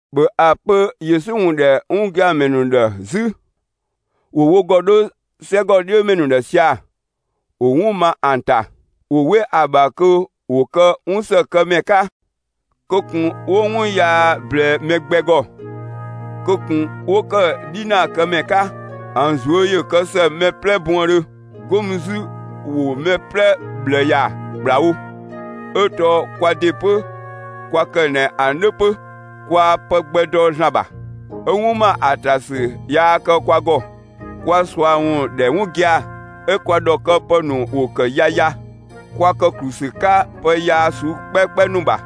‑Bhö ‑a pö Yesu ‑wun ‑dhɛ 'wun gia‑ ‑mɛ ‑nu ‑dhë 'zü, ‑wo wo ‑gɔ 'dho 'sɛgɔ 'dhiö ‑mɛ ‑nu ‑dhë sia‑; ‑wo 'wun ma ‑an ‑ta. ‑Wo 'we ‑a ‑bha kö ‑wo kë 'wun ‑së kë ‑mɛ 'ka! Kö ꞊kun 'wo 'wun yaa ꞊blɛɛ mɛ gbɛ ‑gɔ! Kö ꞊kun 'wo ‑kë 'dhinaa kë ‑mɛ 'ka! ‑An ꞊zuö' ‑yö kë ‑së mɛ 'plɛ buëndhö! 'Go mü 'zü ‑wo mɛ 'plɛ ꞊bhlë ‑ya ‑kplawo! 'Ö tɔɔ kwa ‑de 'pö kwa ‑kë ꞊nɛ ‑an 'dhö 'pö. Kwaa pë gbɛ dɔ ‑Zlan ‑bha, 'ö 'wun ma ‑a ‑ta ‑sü yaa kë kwa ‑gɔ; kwa ꞊sua ‑wun ‑dhɛ 'wun gia‑, 'ö kwa ‑dhɔkëpë ‑nu ‑wo ‑kë yaya. Kwa ‑kë ‑klu ‑sü 'ka pë yaa ꞊suu'‑ 'kpɛkpɛ ‑nu ‑bha,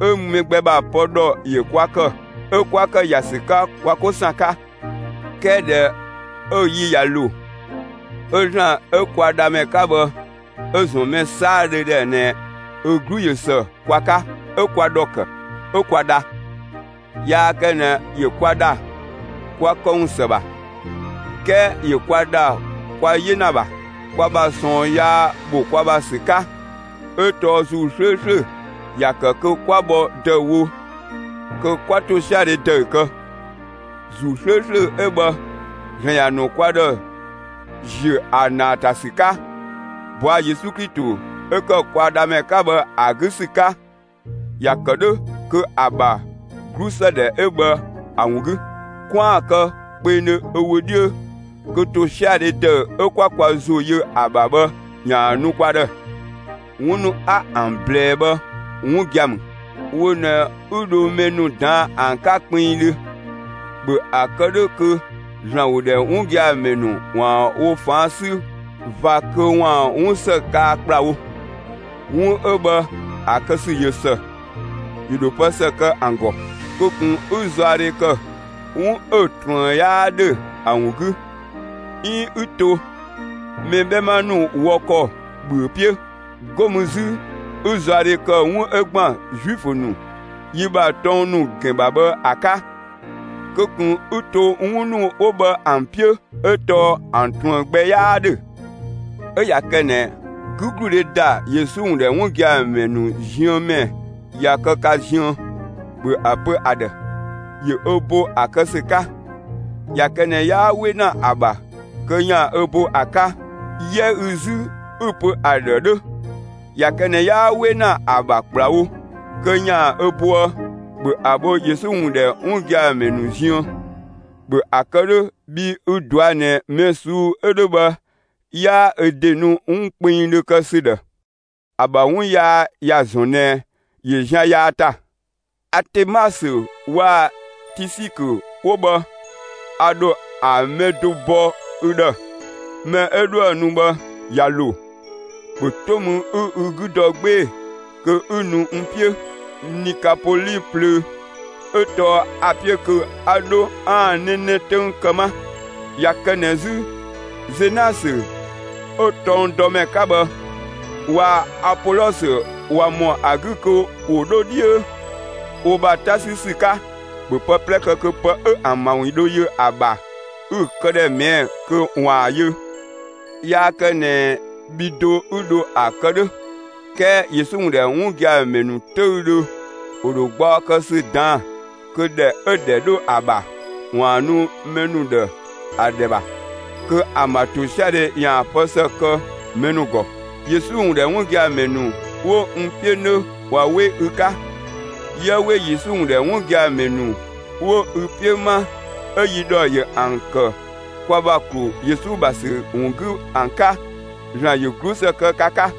'ö mɛ gbɛ ‑bha pë ‑dhɔ ‑yö kwa ‑kë; 'ö 'kwa ‑kë ‑ya ‑sü 'ka kwa 'ko ‑san 'ka. 'Kɛɛ ꞊dhɛ 'ö‑ yi ꞊ya ‑lo, 'ö ‑Zlan 'ö kwa Dhamɛ 'ka bhë 'ö‑ ‑zɔn mɛ 'saadhö ‑dhë ꞊nɛ ö 'glu ꞊yö ‑së kwa 'ka, 'ö kwa ‑dhɔ ‑kë; 'ö kwa dha. Yaa kë ꞊nɛ ‑yö kwa ‑dha, kwa këwun ‑së ‑bha, 'kɛɛ ‑yö kwa ‑dha kwa 'yena ‑bha, kwa ‑bha ꞊sɔɔn yaa ‑bho kwa ‑bha ‑sü 'ka, 'ö tɔɔ ‑Zuu 'slööslö ‑ya ‑kë kö 'kwa bhɔ ‑dëüwo kö 'kwa ‑tosiadhe ‑dëü kë. ‑Zuu 'slööslö 'ö bhë ‑Zlan ‑ya ‑nu kwa ‑dhë ‑ziö ‑a ‑naa ‑ta ‑sü 'ka, ꞊bɔa' Yesu Klito 'ö ‑kë kwa Dhamɛ 'ka bhë ‑a 'gü ‑sü 'ka. ‑Ya ‑kë 'dhö kö ‑a ‑bha 'glusëdhɛ 'ö bhë ‑a ‑wun 'gü, 'kwaan‑ kë kpengdhö ö wö 'dhiö kö ‑tosiadhe ‑dëü 'ö 'kwa kwa ‑zo yö ‑a ‑bha bhë ‑yaan ‑a nu kwa ‑dhë. 'Wun ‑nu 'a ‑an ꞊blɛɛ bhë 'wun gia‑ ‑mü; wo ꞊nɛ 'ü dho mɛ ‑nu ꞊daan' ‑an 'ka kpinngdhö. ‑Bhö ‑a kë 'dhö kö ‑Zlan ‑wun ‑dhɛ 'wun gia‑ ‑mɛ ‑nu ‑waan wo ꞊faan' 'sü ꞊va kö ‑waan 'wun ‑së kaa ‑kplawo. 'Wun 'ö bhë ‑a kë ‑sü ꞊yö ‑së; ‑yö ‑dho pë ‑së kë ‑an ‑gɔ. Kö ꞊kun 'ü zaɔdhe ‑kë 'wun 'ö‑ ꞊truën 'yaa ‑dhö ‑a ‑wun 'gü, 'iin 'ü to mɛ 'bhɛma ‑nu wɔ ‑kɔ ‑bhüö 'piö! 'Go mü 'zü 'ü zaɔdhe ‑kë 'wun 'ö ‑gban Zuifö ‑nu yi ‑bha tɔng ‑nu ‑gɛn ‑bha bhë ‑a 'ka! Kö ꞊kun 'ü to 'wun ‑nu 'wo bhë ‑an 'piö, 'ö tɔɔ ‑an ꞊truën gbɛ 'yaa 'dhö. 'Ö ꞊ya kë ꞊nɛ 'gügludhe ‑da Yesu ‑wun ‑dhɛ 'wun gia‑ ‑mɛ ‑nu ziën ‑mɛ ꞊ya kë ka ziën, ‑bhö ‑a pö ‑a ‑dhë, ‑yö ö bo ‑a kë ‑sü 'ka! ꞊Ya kë ꞊nɛ 'yaa 'we ‑na ‑a ‑bha kö ‑yaan ö bo ‑a 'ka, 'yɛ ü 'zü 'ü‑ pö ‑a ‑dhë 'dhö! ꞊Ya kë ꞊nɛ 'yaa 'we ‑na ‑a ‑bha ‑kplawo kö ‑yaan ö boë, ‑bhö ‑a bho Yesu ‑wun ‑dhɛ 'wun gia‑ ‑mɛ ‑nu ziën! ‑Bhö ‑a kë 'dhö, bhii ü‑ ꞊dɔa' ꞊nɛ mɛ ꞊suu'‑ 'ö 'dhö bhë 'yaa ö ‑de nu 'wun kpengdhö kë ‑sü ‑dhë. ‑A ‑bha 'wun yaa ‑ya ‑zɔn ꞊nɛ ‑yö zian yaa ‑ta. Atemasö waa‑ Tisikö 'wo bhë, a ‑dho ‑an mɛ do bɔ ü ‑dhë. Mɛ 'ö 'dhoë‑ nu bhë, ꞊ya ‑lo, ‑bhö 'to mü 'ü ü 'gü dɔ 'gbee‑ kö 'ü nu n 'piö Nikapoli plöö; 'ö tɔɔ a‑ 'piö kö 'a 'dho 'aan‑ 'nɛnɛ 'töng kë 'ma. ꞊Ya kë ꞊nɛ 'zü Zenasö 'ö tɔngdɔmɛ 'ka bhë waa‑ Apolɔsö ꞊wa ‑mɔ ‑a 'gü kö ‑wo 'dho 'dhiö wo ‑bha 'ta 'sü ‑sü 'ka, ‑bhö pë 'plɛ kë kö pë 'ö ‑an ‑bha ‑wun dho yö ‑a ‑bha, 'ü‑ këdhɛ ꞊mɛɛ'‑ kö ‑waan ‑a yö. Yaa kë ꞊nɛ bhi do 'ü dho ‑a kë 'dhö, 'kɛɛ Yesu ‑wun ‑dhɛ 'wun gia‑ ‑mɛ ‑nu 'töüdhö ‑wo ‑dho gbaɔ kë ‑sü ꞊daan'‑ kö ‑dhɛ 'ö‑ ‑dhɛ 'dho ‑a ‑bha ‑waan nu mɛ ‑nu ‑dhë ‑a ‑dhɛ ‑bha, kö ‑an ‑bha ‑tosiadhe ‑yaan pë ‑së kë mɛ ‑nu ‑gɔ. Yesu ‑wun ‑dhɛ 'wun gia‑ ‑mɛ ‑nu 'wo n 'piö 'nö ꞊wa 'we ü 'ka. 'Yië 'we Yesu ‑wun ‑dhɛ 'wun gia‑ ‑mɛ ‑nu 'wo ü 'piö 'ma 'ö yi ‑dhɔ ‑yö ‑an ‑kë kwa ‑bha ‑klu Yesu ‑bha ‑sü ‑wun 'gü ‑an 'ka! ‑Zlan ‑yö 'glusë kë ka 'ka!